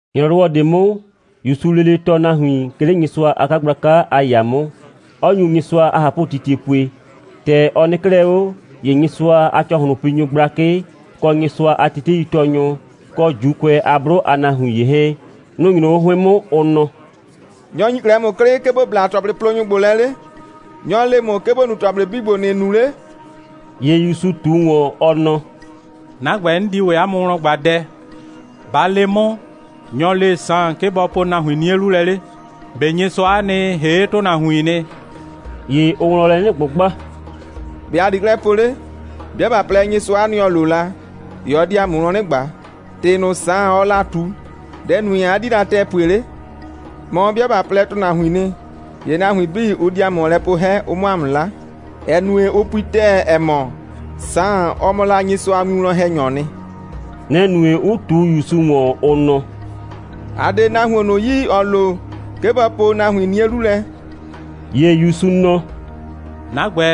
‑Nyrɔwɔ ꞊de 'mʋ, ‑Yusuu lele tɔɔ nahuin, 'ke 'le Nyɩsʋa a 'kagblaka a ‑yaa 'mʋ, 'ɔ nyu Nyɩsʋa a ꞊hapʋtitie pue. ‑Tɛ ɔ nɩ 'klɛɛ 'o, ‑ye Nyɩsʋa a ‑cɔhlʋnpinyʋ gblakɩ, kɔ Nyɩsʋa a teteitɔɔnyʋ, kɔ ‑Juukʋɛ a 'blʋ a nahuin ‑ye 'hɛɛn, nʋ‑ nyro 'o 'hʋɩn 'mʋ, ʋ nɔ: «Nyɔ‑ ‑nyi 'klɛɛ ‑mʋ 'klɩ, 'ke ‑bo bla ‑tɔplɩplonyʋ ‑gbo lɛ 'le? Nyɔ‑ le ‑mʋ, 'ke ‑bo nu ‑tɔplɩ 'bii ‑gbo, ‑nɩɩ nu 'le?» ‑Ye ‑Yusu ꞊tu ‑wɔn, ɔ nɔ: «'Na ‑gbɛ, 'n di ‑wɛ 'a mʋ wlɔn ꞊gba dɛ. Ba le 'mʋ, nyɔ‑ le la Saan, 'ke bɔ po la nahuin 'nie 'lu lɛ 'le? ꞊Be Nyɩsʋa'a nɩ, ‑hee' ‑tʋnahuiin nɩ?» ‑Ye ʋʋ wlɔn lɛ 'nɩ ꞊gbʋgba: «‑Be' ‑a di 'klɛɛ po 'le? 'Bɩa ꞊ba plɛ: Nyɩsʋa'a nɩ, ‑ɔ lo la, ‑ye ɔ di ‑a mʋ wlɔn 'nɩ ꞊gba: ‑Tɩ ꞊nʋ, Saan, ɔɔ la ꞊tu, dɛ‑ nue, 'a 'di la ‑tɛɛ pue 'le? Mɔ, 'bɩa ꞊ba plɛ, ‑tʋnahuiin nɩ, ‑ye nahuin 'bii, ʋ di ‑a mʋ ‑wɔn lɛ poo 'hɛ, ʋ 'mʋ ‑a mʋ 'la, ‑ɛ nue, ʋ pui ‑tɛɛ, ‑ɛ mɔ, Saan, ɔ mɔ la Nyɩsʋa a winwlɔn‑hɛnyɔɔ nɩ.» Nɛ‑ nue, 'ʋ ꞊tu ‑Yusu ‑wɔn, ʋ nɔ: «‑A 'de nahuon ꞊nʋ yi, ‑ɔ lo, 'ke bɔ po nahuin 'nie 'lu lɛ.» ‑Ye ‑Yusu nɔ: «'Na ‑gbɛ,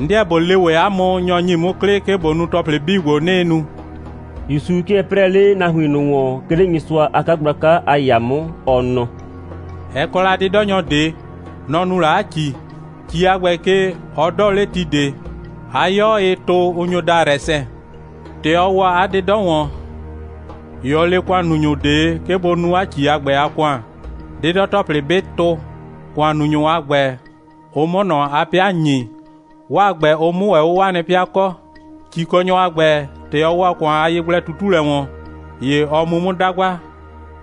'n 'deɛ ꞊bo le ‑wɛ 'a mʋ, nyɔ‑ ‑nyi 'mʋ 'klɩ, 'ke ꞊bo nu ‑tɔplɩ 'bii ‑gbo, 'nɩɩ nu.» (‑Yusu 'kɩɛ 'prɛɛ 'le nahuin ꞊nʋ ‑wɔn, 'ke 'le Nyɩsʋa a 'kagblaka a ‑yaa 'mʋ,) ɔ nɔ: «Ɛ kɔ la 'dɩdɔnyɔ ꞊de. Nɔ‑ nu la 'a ‑ci. ‑Ci a ‑gbɛ ke, ɔ 'dɔɔ 'le ti ꞊de. 'A 'yɔ, ɩɩ tʋ, ʋ nyo daa rɛsɛn. ‑Tɛ ɔ ‑wɔ 'a 'dɩdɔ ‑wɔn, ‑ye ɔ le ‑kʋannunyʋ ꞊de, 'ke bʋ nu ‑ci a ‑gbɛ a ‑kʋan, 'dɩdɔ‑tɔplɩ 'bɩ tʋ, ‑kʋannunyʋ a ‑gbɛ, ʋ 'mʋ ꞊nɔ 'a 'pɩa ‑nyi, 'waa ‑gbɛ, ʋ 'mʋ ‑wɛ 'o 'waa nɩ 'pɩa kɔ. ‑Cikɔnyɔ a ‑gbɛ, ‑tɛ ɔ ‑wɔ ‑kʋan a yegblɛ꞊tutulɛ ‑wɔn, ‑ye ɔ mu 'mʋ 'dagba,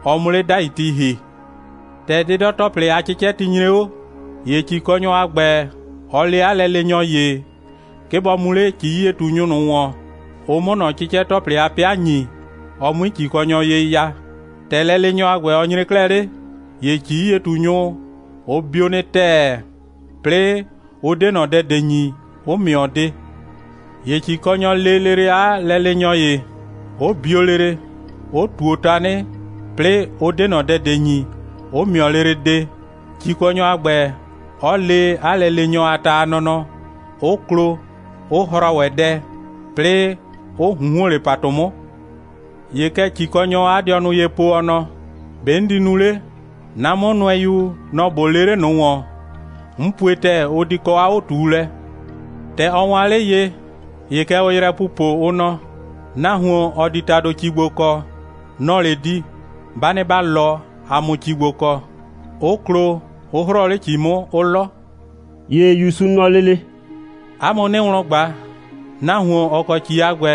ɔ 'mʋ 'le 'dai ti ‑hi. ‑Tɛ 'dɩdɔ‑tɔplɩ a 'cɩcɛti nyre 'o, ‑ye ‑cikɔnyɔ a ‑gbɛ, ɔ le 'a lɛleenyɔ ‑ye, 'ke bɔ mu 'le ‑ci'yie꞊tunyʋ ꞊nʋ ‑wɔn, ʋ 'mʋ ꞊nɔ 'cɩcɛ‑tɔplɩ a 'pɩa ‑nyi, ɔ 'mui ‑cikɔnyɔ ye ya. ‑Tɛ lɛleenyɔ a ‑gbɛ, ɔ nyre 'klɛɛ 'le, ‑ye ‑ci'yie꞊tunyʋ, ʋ bio nɩ ‑tɛɛ, 'plɩɩ, ʋ 'de ꞊nɔ dɛ ꞊de ‑nyi, 'ʋ ‑mɩɔ de. ‑Ye ‑cikɔnyɔ lee lele 'a lɛleenyɔ ‑ye, 'ʋ bio lele, 'ʋ ꞊tuo tanɩ, 'plɩɩ, ʋ 'de ꞊nɔ dɛ ꞊de ‑nyi, 'ʋ ‑mɩɔ lele de, ‑cikɔnyɔ a ‑gbɛ, 'ɔ le 'a lɛleenyɔ a ta a nɔnɔ, 'ʋ klo, 'ʋ hrɔɔ ‑wɛ dɛ, 'plɩɩ 'ʋ ꞊hunhuon 'le ‑patʋ 'mʋ. ‑Ye kɛ ‑cikɔnyɔɔ 'a dɩɔnʋ ye po, ɔ nɔ: ‑Be' 'n di nu 'le? 'Na 'mʋnʋɛyu, nɔ‑ ꞊bo lee 'le ꞊nʋ ‑wɔn. 'N pue ‑tɛɛ, ʋ di kɔ 'a 'o꞊tuulɛ. ‑Tɛ ɔ waan 'le ye, ‑ye kɛ ʋʋ yrɛ pupo, ʋ nɔ: Nahuon, ‑ɔ di ‑tado ‑ci ‑gbo kɔ, nɔ‑ɔ 'le di. Ba nɩ ‑ba 'lɔ, ‑a 'mʋ ‑ci ‑gbo kɔ, 'ʋ klo, 'ʋ 'hrɔɔ 'le ‑ci 'mʋ, 'ʋ 'lɔ.» ‑Ye ‑Yusu nɔ lele: «'A mʋ 'nɩɩ wlɔn ꞊gba, nahuon, ‑ɔ kɔ ‑ci a ‑gbɛ,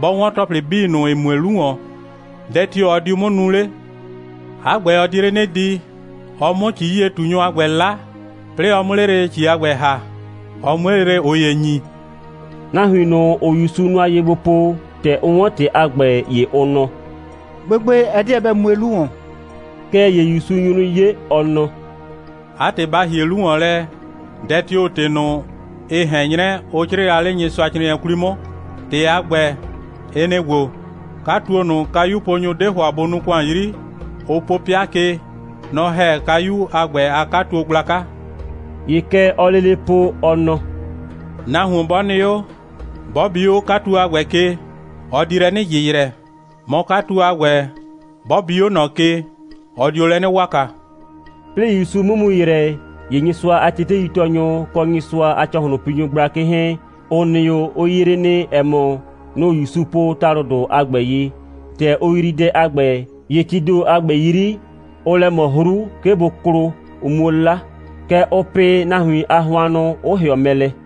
'bɔ 'wɔn ‑tɔplɩ 'bii ꞊nʋ, ‑ɩ mue 'lu ‑wɔn, dɛ tio‑ ɔ diu 'mʋ nu 'le? 'A ‑gbɛ, ɔ di 'le 'nɩ di, ɔ 'mʋ ‑ci'yie꞊tunyʋ a ‑gbɛ 'la, 'plɩɩ ɔ 'mʋ 'le lele ‑ci a ‑gbɛ ‑ha, ɔ 'mue lele ꞊ʋ ‑ye ‑nyi.» Nahuin ꞊nʋ, ‑ʋʋ ‑Yusu nʋa ye gbo po, ‑tɛ ʋ 'wɔn ‑tɩ a ‑gbɛ, ‑ye ʋ nɔ: «Gbegbe, ɛ 'deɛ bɛ mue 'lu ‑wɔn.» Kɛɛ ‑ye ‑Yusu nyu 'nɩ 'ye, ɔ nɔ: «'A ‑tɩ, ba ‑hie 'lu ‑wɔn lɛ, dɛ tio‑ ‑tɩ ꞊nʋ, ɩ ꞊hɛn 'nyrɛ, ʋ 'crɩɩ la 'le Nyɩsʋacrɩɩnɩɛ 'kwli 'mʋ. ‑Tɩ a ‑gbɛ, ɩ nɩ‑ ‑gbo: 'Katuo ꞊nʋ, kayuponyʋ 'de ‑hʋa bʋ nuu ‑kʋan 'yri, ʋ po 'pɩa ke, nɔ‑ ‑hɛ kayu a ‑gbɛ a 'katuo gblaka.» ‑Ye kɛ ɔɔ lele po, ɔ nɔ: «Nahuon 'bɔ nɩ 'o, 'bɔ bi 'o 'katuo a ‑gbɛ ke, ɔ di lɛ 'nɩ ‑yɩyrɛ, mɔ, 'katuo a ‑gbɛ, 'bɔ bi 'o ꞊nɔ ke, ɔ dio lɛ 'nɩ waka.» 'Plɩɩ ‑Yusu 'mʋ mu ‑yrɛ, ‑ye Nyɩsʋa a teteitɔɔnyʋ, kɔ Nyɩsʋa a ‑cɔhlʋnpinyʋ gblakɩ 'hɛɛn, ‑ʋ nɩ 'o, ʋ yree nɩ, ‑ɛ mɔ, nʋ‑ ‑Yusu po ‑talʋdʋ a ‑gbɛ ye. ‑Tɛ ʋ yrii dɛ a ‑gbɛ, ‑ye tii ‑do a ‑gbɛ 'yri, ʋʋ lɛ ꞊mɔ 'hru, 'ke bʋ klo, ʋ 'muo 'la. Kɛɛ, ʋʋ pɩ nahuin a hʋannʋ, 'ʋ ‑hɩɔ mɛ lɛ.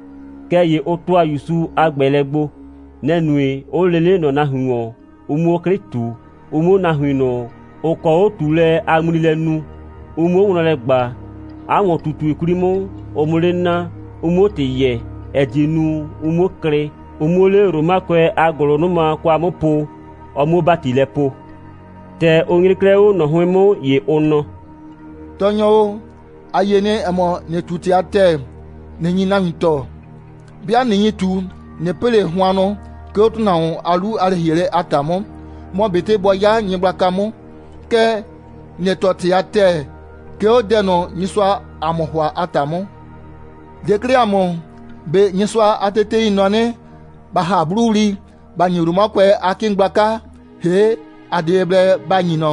Kɛɛ ‑ye ʋ ‑tʋa ‑Yusu a ‑gbɛɛlɛ gbo. Nɛ‑ nue, 'ʋ lee 'le ꞊nɔ nahuin ‑wɔn, ʋ 'mʋ 'o 'klɩ ꞊tu, ʋ 'mʋ o nahuin ꞊nʋ, ‑ʋ kɔ 'o꞊tuulɛ a ŋmli lɛ nu, ʋ 'muo wlɔn lɛ ꞊gba, 'a ‑wɔn꞊tutue 'kwli 'mʋ, ʋ 'mʋ 'le naa, ʋ 'muo ‑tɩ yɛɛ, ‑ɛ die nu, ʋ 'muo klɩ, ʋ 'muo 'le Romakʋɛ a ‑gʋlʋnʋma kwa 'mʋ po, ɔ 'muo ‑bati lɛ poo. ‑Tɛ ʋ nyre 'klɛɛ 'o ꞊nɔ 'hʋɩn 'mʋ, ‑ye ʋ nɔ: «Tɔɔnyɔ o, ‑a yie nɩ, ‑ɛ mɔ, ‑nɩɩ ꞊tu ‑tɩ a ‑tɛɛ, ꞊nɩ nyi nahuin tɔɔ. 'Bɩa ꞊nɩ nyi ꞊tu, ꞊nɩ pɩ ꞊le hʋannʋ, 'ke 'o ‑tʋnahuon a 'lu a lɛ‑hielɛ a ‑ta 'mʋ, mɔ ꞊betɩ bɔ 'ya nyɩgblaka 'mʋ. Kɛɛ, ‑nɩɩ tɔɔ ‑tɩ a ‑tɛɛ, 'ke 'o dɛ ꞊nʋ, Nyɩsʋaa ‑a mʋ ‑hʋa a ‑ta 'mʋ. Le 'klɛɛ ‑a mʋ, ꞊be Nyɩsʋa a tetei nɔ 'nɩ, ‑ba ‑ha 'blʋwli, ‑ba ‑nyi Romakʋɛ a 'kɩɩn gblaka, ‑hee', ‑a 'de ye blɛ ‑ba ‑nyi ꞊nɔ?»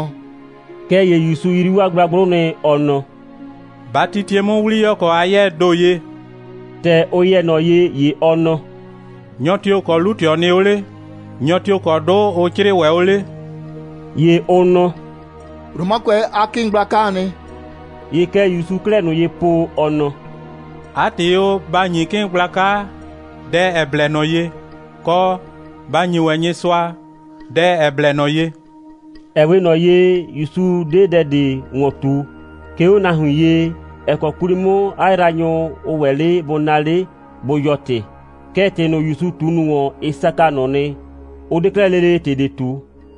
Kɛɛ ‑ye ‑Yusu yrii 'waa gblagblʋ nɩ, ɔ nɔ: «Ba titie 'mʋ 'wliyɔkɔ a 'yɛɛ ‑do ye.» ‑Tɛ ʋ yɛ ꞊nɔ ye, ‑ye ɔ nɔ: «Nyɔ tio‑ kɔ 'lu꞊tɩɔ nɩ 'o 'le? Nyɔ tio‑ kɔ 'dʋ ʋ 'crɩɩ ‑wɛ 'o 'le?» ‑Ye ʋ nɔ: «Romakʋɛ a 'kɩɩn gblakaa nɩ.» ‑Ye kɛ ‑Yusu 'klɛɛ ꞊nʋ ye po, ɔ nɔ: «'A ‑tɩ o, ba ‑nyi 'kɩɩn gblaka dɛ, ‑ɛ blɛ ꞊nɔ ye, kɔ, ba ‑nyi ‑wɛ Nyɩsʋa dɛ, ‑ɛ blɛ ꞊nɔ ye!» Ɛ 'we ꞊nɔ ye, ‑Yusu 'de dɛ ꞊de ‑wɔn ꞊tu, 'ke 'o nahuin ye, ‑ɛ kɔ 'kwli 'mʋ 'a yraanyʋ, ʋ ‑wɛ 'le bʋ naa 'le, bʋ yɔɔ ‑tɩ. Kɛɛ, ‑tɩ ꞊nʋ, ‑Yusu ꞊tu ꞊nʋ ‑wɔn, ɩ saka ꞊nʋ nɩ, 'ʋ 'de 'klɛɛ lele ‑tɩ ꞊de ꞊tu.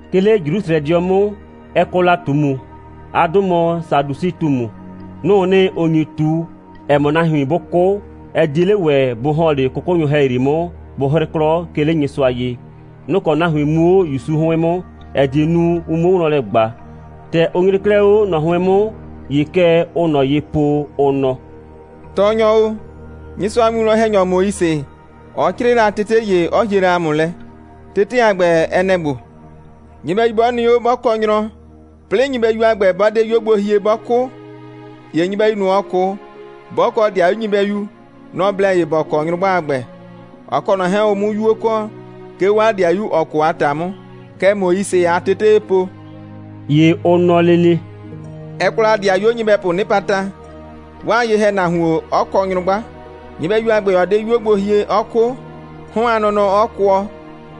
'Ke 'le Jrusrɛdɩɔ 'mʋ, ɛ kɔ la ꞊tumu. 'A 'dʋ mɔ Sadusɩ꞊tumu. Nʋ‑ʋ nɩ, ‑ʋ nyi ꞊tu, ‑ɛ mɔ, nahuin 'bʋ 'kʋ, ɛ 'die 'le ‑wɛ bʋ ‑hɔn 'le 'kʋkʋnyʋ ‑hɛyri 'mʋ, bʋ 'hrɩ 'klɔ, 'ke 'le Nyɩsʋa ye. Nʋ‑ kɔ nahuin mu 'o ‑Yusu 'hʋɩn 'mʋ, ‑ɛ die nu, ʋ 'muo wlɔn lɛ ꞊gba. ‑Tɛ ʋ nyre 'klɛɛ 'o ꞊nɔ 'hʋɩn 'mʋ, ‑ye kɛ ʋʋ ꞊nɔ ye po, ʋ nɔ: «Tɔɔnyɔ o, Nyɩsʋa a winwlɔn‑hɛnyɔ Moise, ɔ 'crɩɩ la tete ‑ye, 'ɔ hie la ‑a mʋ lɛ. Tete a ‑gbɛ, ɛ nɛ‑ ‑gbo: Nyɩbɛyu 'bɔ nɩ 'o, 'bɔ kɔ nyrɔ, 'plɩɩ nyɩbɛyu a ‑gbɛ, 'bɔ 'de 'yuo gbo hie, 'bɔ 'kʋ, ‑ye nyɩbɛyu ꞊nʋ, ‑ɔ 'kʋ, 'bɔ kɔ 'dɩayu nyɩbɛyu, nɔ‑ blɛ ye ‑bɔ kɔ nyrʋgba a ‑gbɛ, ɔ kɔ ꞊nɔ 'hɛɛn, ʋ 'mʋ 'yuo kɔ, 'ke 'o 'a 'dɩayu, ‑ɔ 'kʋ a ‑ta 'mʋ. Kɛ Moise a tetee po.» ‑Ye ʋ nɔ lele: «Ɛ kɔ la ‑dɩayuo nyɩbɛpʋʋ 'nɩpata, 'waa ye‑hɛnahuon 'ɔ kɔ nyrʋgba, nyɩbɛyu a ‑gbɛ 'ɔ 'de 'yuo gbo hie, 'ɔ 'kʋ, 'hɔn a nɔnɔ 'ɔ kʋɔ,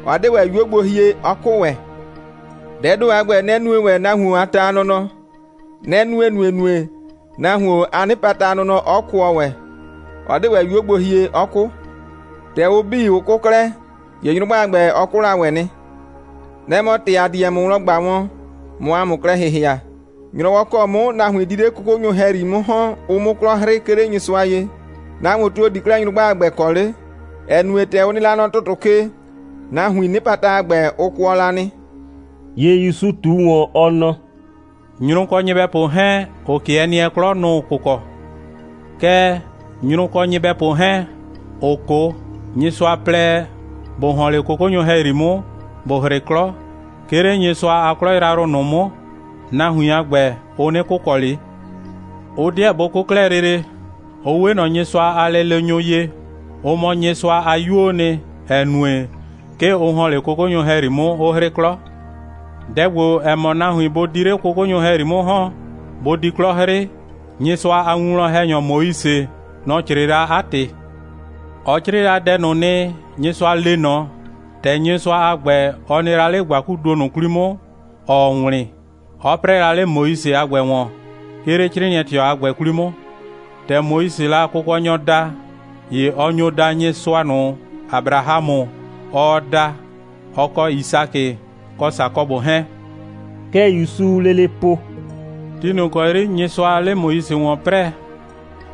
'ɔ 'de ‑wɛ 'yuo gbo hie, 'ɔ 'kʋ ‑wɛ. Dɛɛ ‑do a ‑gbɛ, nɛ‑ nue ‑wɛ nahuon a ta a nɔnɔ. Nɛ‑ nue ‑nuenue, nahuon a 'nɩpata a nɔnɔ 'ɔ kʋɔ ‑wɛ, 'ɔ 'de ‑wɛ 'yuo gbo hie, 'ɔ 'kʋ. ‑Tɛ ʋ 'bii, ʋ 'kʋ 'klɛɛ, ‑ye nyrʋgba a ‑gbɛ, ɔ 'kʋ la ‑wɛ nɩ. Nɛ‑ mɔ ‑tɩ ‑a di wɛn ‑mʋ wlɔn ꞊gba wɔn, ꞊mʋ ‑a mʋ klɛ ‑hɩhɩa. ‑Nyrɔwɔ ‑kɔ 'mʋ nahuin di 'le 'kʋkʋnyʋ ‑hɛyri 'mʋ ‑hɔn, ʋ 'mʋ 'klɔ 'hrɩ, 'ke 'le Nyɩsʋa ye, nahuon tio‑ di 'klɛɛ nyrʋgba a ‑gbɛ kɔ 'le, ‑ɛ nue, ‑tɛ ʋ nɩ la nɔ ‑tʋtʋ ke, nahuiin 'nɩpata a ‑gbɛ, ʋ kʋɔ la nɩ.» ‑Ye ‑Yusu ꞊tu ‑wɔn, ɔ nɔ: «Nyrʋ kɔ nyɩbɛpʋ 'hɛɛn, ‑ʋ 'kɩɛ nɩɛ 'klɔ, nʋ‑ʋ kʋkɔ. Kɛɛ, nyrʋ kɔ nyɩbɛpʋ 'hɛɛn, ‑ʋ 'kʋ, Nyɩsʋa plɛ, ‑bʋ ‑hɔn 'le 'kʋkʋnyʋ ‑hɛyri 'mʋ, ‑bʋ 'hrɩ 'klɔ, 'ke 'le Nyɩsʋa a 'klɔ yrayrʋ ꞊nʋ 'mʋ, nahuin a ‑gbɛ, ʋ 'nɩ kʋkɔ ꞊le. Ʋ 'deɛ bʋ 'kʋ 'klɛɛ lele. Ʋ 'we ꞊nɔ Nyɩsʋa a lɛleenyʋ ye. Ʋ mɔ Nyɩsʋa a 'yuoo nɩ, ‑ɛ nue, 'ke ʋ ‑hɔn 'le 'kʋkʋnyʋ ‑hɛyri 'mʋ, 'ʋ 'hrɩ 'klɔ. Dɛ ‑gbo, ‑ɛ mɔ nahuin bʋ di 'le 'kʋkʋnyʋ ‑hɛyri 'mʋ ‑hɔn, bʋ di 'klɔ 'hrɩ, Nyɩsʋa a winwlɔn‑hɛnyɔ Moise, nɔ‑ 'crɩɩ la 'a ‑tɩ. Ɔ 'crɩɩ la dɛ ꞊nʋ nɩ, Nyɩsʋa le ꞊nɔ, ‑tɛ Nyɩsʋa a ‑gbɛ, ɔ nɩ la 'le ‑gbakuduo ꞊nʋ 'kwli 'mʋ, ‑ɔɔ wlɩn, 'ɔ 'prɛɛ la 'le Moise a ‑gbɛ ‑wɔn. 'Ke 'le 'crɩɩnɩɛ꞊tɩɔ a ‑gbɛ 'kwli 'mʋ, ‑tɛ Moisee la Kʋkɔnyɔ da, ‑ye ɔ nyo daa Nyɩsʋa ꞊nʋ, Abrahamʋ, ɔɔ da, ɔ kɔ Yisakɩ, kɔ Sakɔbʋ 'hɛɛn.» Kɛ ‑Yusuu lele po: «Ti ꞊nʋ ‑kɔ 'yri Nyɩsʋaa 'le Moise ‑wɔn 'prɛɛ,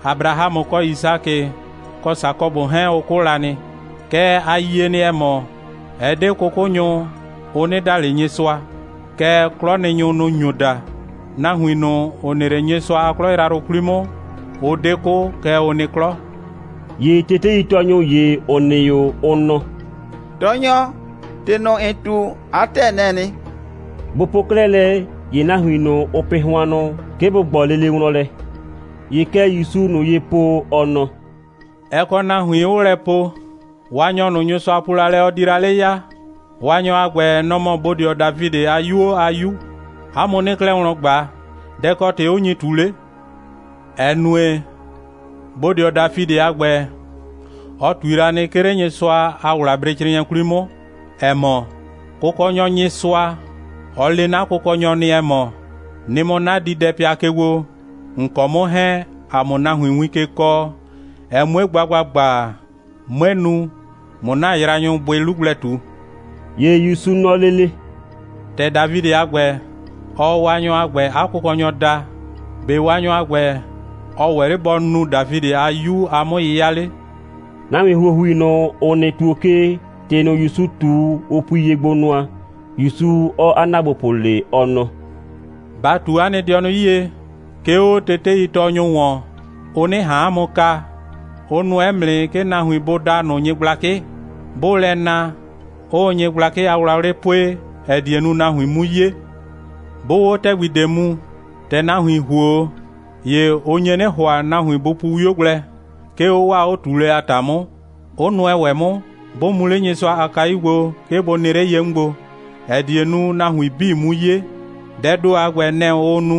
Abrahamʋ kɔ Yisakɩ kɔ Sakɔbʋ 'hɛɛn, ʋ 'kʋ la nɩ. Kɛɛ, ‑a yie nɩ, ‑ɛ mɔ, ɛ 'de 'kʋkʋnyʋ, ʋ 'nɩ da ꞊le Nyɩsʋa, kɛɛ, 'klɔnɩnyʋ, nʋ‑ nyo da. Nahuin ꞊nʋ, ‑ʋ nɩ 'le Nyɩsʋa a 'klɔ yrayrʋ 'kwli 'mʋ, ʋ 'de 'kʋ, kɛɛ, ʋ nɩ 'klɔ.» ‑Ye teteitɔɔnyʋ ‑ye, ‑ʋ nɩ 'o, ʋ nɔ: «Tɔɔnyɔ, ‑tɩ ꞊nʋ, ‑n ꞊tu, 'a ‑tɛɛ, nɛ‑ɛ nɩ.» Bʋ po 'klɛɛ lɛ, ‑ye nahuin ꞊nʋ, ʋʋ pɩ hʋannʋ, 'ke bʋ ꞊gbɔ lele wlɔn lɛ. ‑Ye kɛ ‑Yusuu ꞊nʋ ye po, ɔ nɔ: «Ɛ kɔ nahuin, 'ʋʋ lɛ po: Waanyɔ ꞊nʋ, Nyɩsʋa po la lɛ, ɔ di la 'le ya, Waanyɔ a ‑gbɛ, nɔ‑ mɔ bodɩɔ Dafidɩ a 'yuo a 'Yu. 'A mʋ 'nɩɩ 'klɛɛ wlɔn ꞊gba: Dɛ‑ kɔ ‑tɩ 'ʋ nyi ꞊tu 'le? ‑Ɛ nue, bodɩɔ Dafidɩ a ‑gbɛ, ɔ ꞊tui la nɩ, 'ke 'le Nyɩsʋa a ‑wlabrecrɩɩnɩɛ 'kwli 'mʋ, ‑ɛ mɔ: Kʋkɔnyɔ Nyɩsʋa, ɔ le 'na Kʋkɔnyɔ nɩ, ‑ɛ mɔ: Nɩ mɔ 'na diidɛpɩa ke gbo, ‑n kɔ 'mʋ 'hɛɛn, ‑a 'mʋ nahuin win ke kɔɔ, ɛ 'mue gba ‑gbagba, 'mue nu, ꞊mʋ ‑na yraanyʋ bʋɩ 'lu gblɛ ꞊tu.» ‑Ye ‑Yusu nɔ lele: «‑Tɛ Dafidɩ a ‑gbɛ, ɔɔ Waanyɔ a ‑gbɛ 'a Kʋkɔnyɔ daa, ‑be' Waanyɔ a ‑gbɛ, ɔ ‑wɛ 'le bɔ nu Dafidɩ a 'Yu a 'mʋ'yɩya 'le?» Nahuin ‑huohui ꞊nʋ, ‑ʋ nɩ ‑tuo ke, ‑tɩ ꞊nʋ, ‑Yusu ꞊tu, ʋ pui ye gbo nʋa, ‑Yusu 'ɔɔ 'a ‑naagbopʋ le, ɔ nɔ: «Ba ꞊tu 'a nɩ dɩɔnʋ 'yie, 'ke 'o teteitɔɔnyʋ ‑wɔn, ʋ 'nɩ ꞊han 'a mʋ kaa. Ʋ nʋɛ 'mʋ nɩ, 'ke nahuin bʋ daa ꞊nʋ nyɩgblakɩ. 'Bʋʋ lɛ na, 'ʋʋ nyɩgblakɩ a wlawlɩ pue, ‑ɛ die nu, nahuin 'mu 'ye. 'Bʋʋ 'o 'ɛ nɩ ‑tɛgbi ꞊de mu, ‑tɛ nahuin ‑huo 'o, ‑ye ʋ nye 'nɩ ‑hʋa, nahuin bʋ pu 'wio gblɛ, 'ke 'o 'waa 'o꞊tuulɛ a ‑ta 'mʋ, 'ʋ nʋɛ ‑wɛ 'mʋ, 'bʋ mu 'le Nyɩsʋa a kayu gbo, 'ke bʋ nɩ 'le ye 'mʋ gbo, ‑ɛ die nu, nahuin 'bii 'mu 'ye. Dɛɛ ‑do a ‑gbɛ, nɛ‑ ʋʋ nu,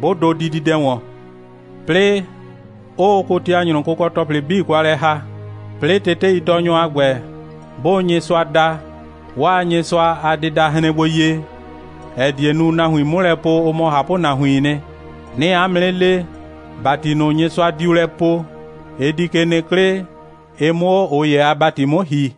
'bʋ dʋ dididɛ ‑wɔn. 'Plɩɩ, 'ʋʋ kotianyrʋ kʋkɔ‑tɔplɩ 'bii ꞊nʋ kwa lɛ ‑ha. 'Plɩɩ, teteitɔɔnyʋ a ‑gbɛ, 'bʋʋ Nyɩsʋa da, 'waa Nyɩsʋa a dɩda hren gbo ye, ‑ɛ die nu, nahuin 'mʋ lɛ po, ʋ mɔ ꞊hapʋnahuiin nɩ. 'Nɩɩ 'a mʋ 'nɩ le, ‑bati ꞊nʋ, Nyɩsʋa diu lɛ poo, ɩ di ke nɩ 'klɩ, ɩ 'mʋ 'o ꞊ʋ ‑ye a ‑bati 'mʋ ‑hi.»